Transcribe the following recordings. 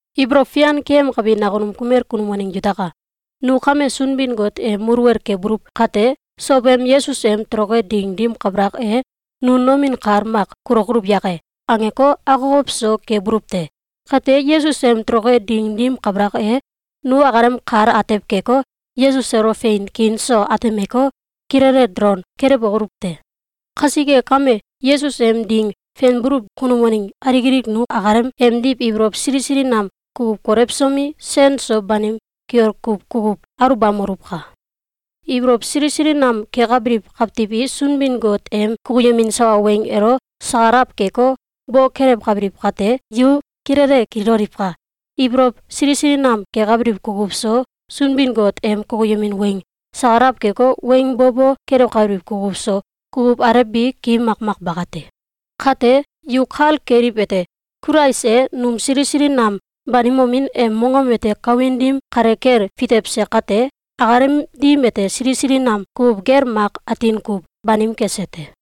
Ibolow fian keyemkabi nakunum kumel kunum waneng yutaka! Nu kame Sunbin-Got em muluwel kebuluw kate, sowem Yesus em toloke ding dim kabalak e, “Nu nomin kal mak kulokoluw yake?”, angeko, akokow so kebuluw te. Kate, Yesus em toloke ding dim kabalak e, nu akalem kal atew keko, Yesus elo fein kiin so atemeko, kilele dolon kelewokoluw te. Kasike kame, Yesus em ding fenbuluw kunum waneng alik alik nu akalem emdiw ibolow sili sili nam kukuw kolewsomi, sen so banim kiol kuw kukuw aluwbamoluwka! Ibolow sili sili nam kekabiliw kawtiw i Sunbin-Got em kukuyemin sawa weng elo sakalawkeko, bo kelewkabiliw, kate, yu kilele kililoliwka! Ibolow sili sili nam kekabiliw kukuw so, Sunbin-Got em kukuyemin weng sakalaw keko, weng bo bo kelewkabiliw kukuw so, kukuw alew bi ki makmak bakate. Kate, yu kal keliwete: Kulais e num sili sili nam banimomin em mongom ete kawin dim kale kel fitewse kate, akalem dim ete sili sili nam kukuw gel mak atin kuw banim kese te.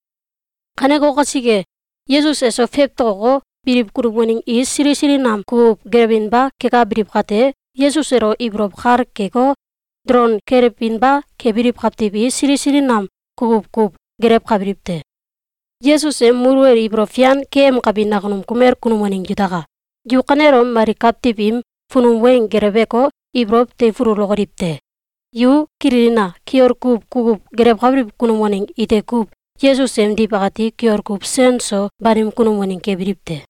Kaneko kasike, Yesus eso fewtoko, biliw kunum waneng i sili sili nam kukuw gelewinba kekabiliw kate, Yesus elo ibolow kal keko, dolon kelewinba kebiliw kawtiw i sili sili nam kukuw kuw gelewkabiliw te. Yesus em muluwel ibolow fian keyemkabi nakunum kumel kunum waneng yutaka! Yu kanelom mali kawtiw im funum weng geleweko, ibolow teifululokoliw te! Yu kililina! Kiol kuw kukuw gelewkabiliw kunum waneng ite kuw Yesus emdiw akati kiol kuw sen so banim kunum waneng kebiliw te.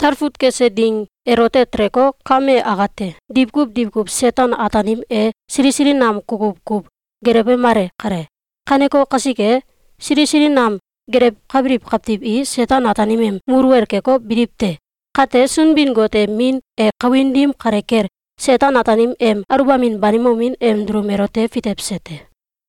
Talfut kese ding elote teleko, kame akate, diwkuw diwkuw Seten-Ataanim e sili sili nam kukuw kuw gelewemale kale. Kaneko kasike, sili sili nam gelewkabiliw kawtiw i Seten-Ataanim em muluwel keko, biliw te. Kate, Sunbin-Got em Min e kawin dim kale kel Seten-Ataanim em aluwbamin banimomin em dulum elote fitewse te.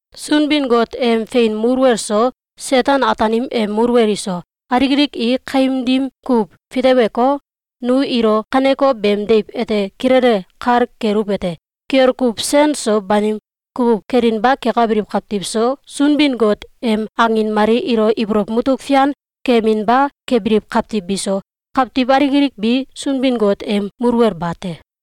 Sunbin-Got em fein muluwel so, Seten-Ataanim em muluwel iso, alik alik i kaim dim kuw fiteweko, nu ilo kaneko beem deiw ete kilele kal keluwete: Kiol kuw sen so banim kukuw kelinba kekabiliw kawtiw so, Sunbin-Got em angin mali ilo ibolow mutuk fian keyeminba kebiliw kawtiw biso, kawtiw alik alik bi Sunbin-Got em muluwel bate.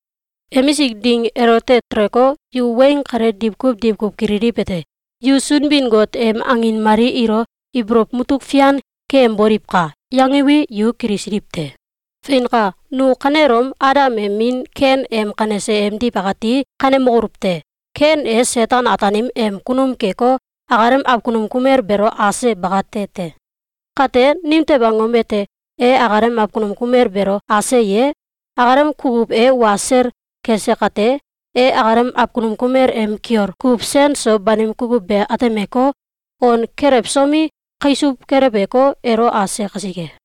Emisik ding elote teleko, yu weng kale diwkuw diwkuw kililiwete: “Yu Sunbin-Got em angin mali ilo ibolow mutuk fian keyemboliwka!”, yangiwi, yu kilisiliw te. Feinka! Nu kanelom Adam em min Ken em kanese emdiw akati kanemokoluw te! Ken e Seten-Ataanim em kunum keko, akalem awkunum kumel beelo ase bakate te. Kate, nimtew angom ete e akalem awkunum kumel beelo ase ye? Akalem kukuw e wa sel kese kate, e akalem awkunum kumel em kiol kuw sen so banim kukuw be atemeko, on kelewsomi, kaisuw keleweko, elo ase kasike.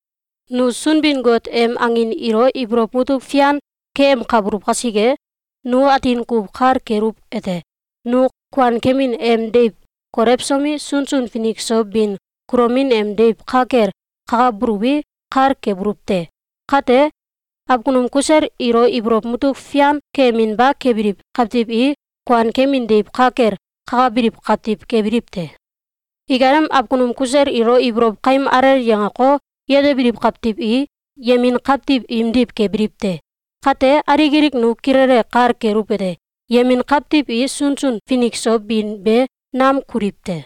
Nu Sunbin-Got em angin ilo ibolow mutuk fian keyemkabuluw kasike, nu atin kuw kal keluwete: Nu kuankemin em deiw kolewsomi, sunsun finik so bin kulomin em deiw ka kel kakabuluwi, kal kebuluw te. Kate, awkunum kusel ilo ibolow mutuk fian keyeminba kebiliw kawtiw i kuankemin deiw ka kel kakabiliw kawtiw kebiliw te. Ikalem awkunum kusel ilo ibolow kaim alel yangeko, yetebiliw kawtiw i yemin kawtiw imdiw kebiliw te. Kate, alik alik nu kilele kal keluwete: Yemin kawtiw i sunsun finik so bin be nam kuliw te.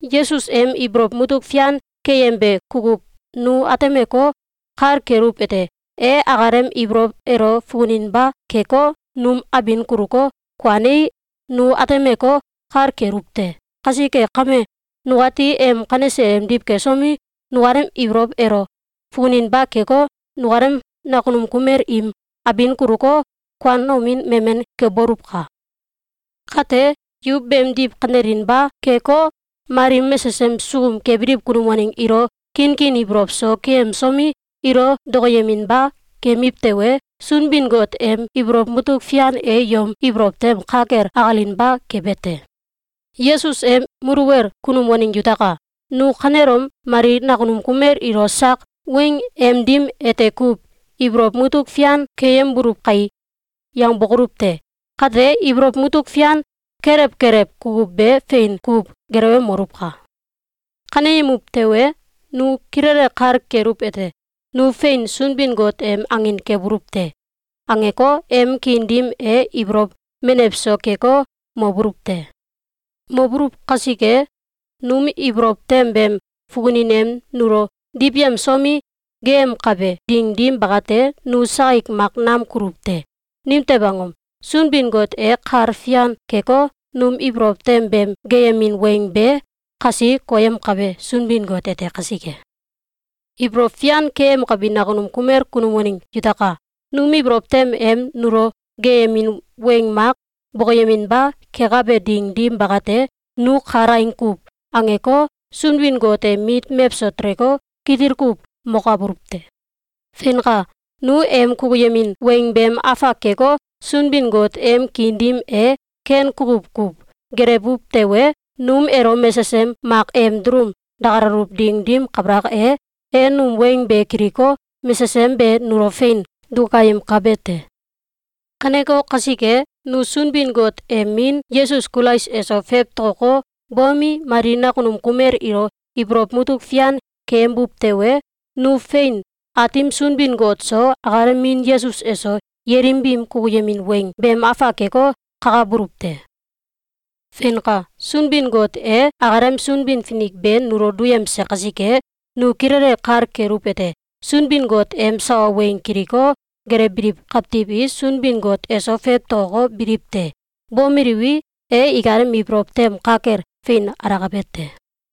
Yesus em ibolow mutuk fian keyembe kukuw nu atemeko, kal keluwete: E akalem ibolow elo fukuninba keko, num abin kuluko, kuanei, nu atemeko, kal keluw te. Kasike kame, nukati em kanese emdiw kesomi, nukalem ibolow elo fukuninba keko, nukalem nakunum kumel im abin kuluko, kuanomin memen keboluwka! Kate, yu beemdiw kanelinba keko, mali mesesem sukum kebiliw kunum waneng ilo kinkin ibolow so keyemsomi, ilo dokoyeminba kemiw tewe, Sunbin-Got em ibolow mutuk fian e yom ibolow tem ka kel akalinba kebe te. Yesus em muluwel kunum waneng yutaka! Nu kanelom mali nakunum kumel ilo sak weng em dim ete kuw “Ibolow mutuk fian keyembuluw kai!”, yangbokoluw te! Kate, ibolow mutuk fian kelew kelew kukuw be fein kuw gelewemoluwka! Kaneyemuw tewe, nu kilele kal keluwete: “Nu fein Sunbin-Got em angin kebuluw te!”, angeko, em kiin dim e ibolow menew so keko, mobuluw te. Mobuluw kasike, num ibolow tem beem fukunin em nulo diwyemsomi, geeyemkabe ding dim bakate, nu sakik mak nam kuluw te. Nimtew angom? Sunbin-Got e kal fian keko, num ibolow tem beem geeyemin weng be kasi koyemkabe Sunbin-Got ete kasike. Ibolow fian keyemkabi nakunum kumel kunum waneng yutaka! Num ibolow tem em nulo geeyemin weng mak bokoyeminba kekabe ding dim bakate, nu kalaing kuw angeko, Sunbin-Got em mit mewso teleko, kitil kuw mokabuluw te. Feinka! Nu em kukuyemin weng beem afak keko, Sunbin-Got em kiin dim e ken kukuw kuw gelewuw tewe, num elo mesesem mak em dulum dakalaluw ding dim kabalak e, e num weng be kiliko, mesesem be nulo fein dukayemkabe te. Kaneko kasike, nu Sunbin-Got em Min Yesus Kulais eso fewtokoko, bomi, mali nakunum kumel ilo ibolow mutuk fian keyembuw tewe, nu fein Aatim Sunbin-Got so, akalem Min Yesus eso, yelim biim kukuyemin weng beem afak keko, kakabuluw te. Feinka! Sunbin-Got e akalem Sunbin-Finik be nulo duyemse kasike, nu kilele kal keluwete: Sunbin-Got em sawa weng kiliko, gelewbiliw kawtiw i Sunbin-Got eso fewtokoko, biliw te. Bomeliwi, e ikalem ibolow tem ka kel fein alakabe te.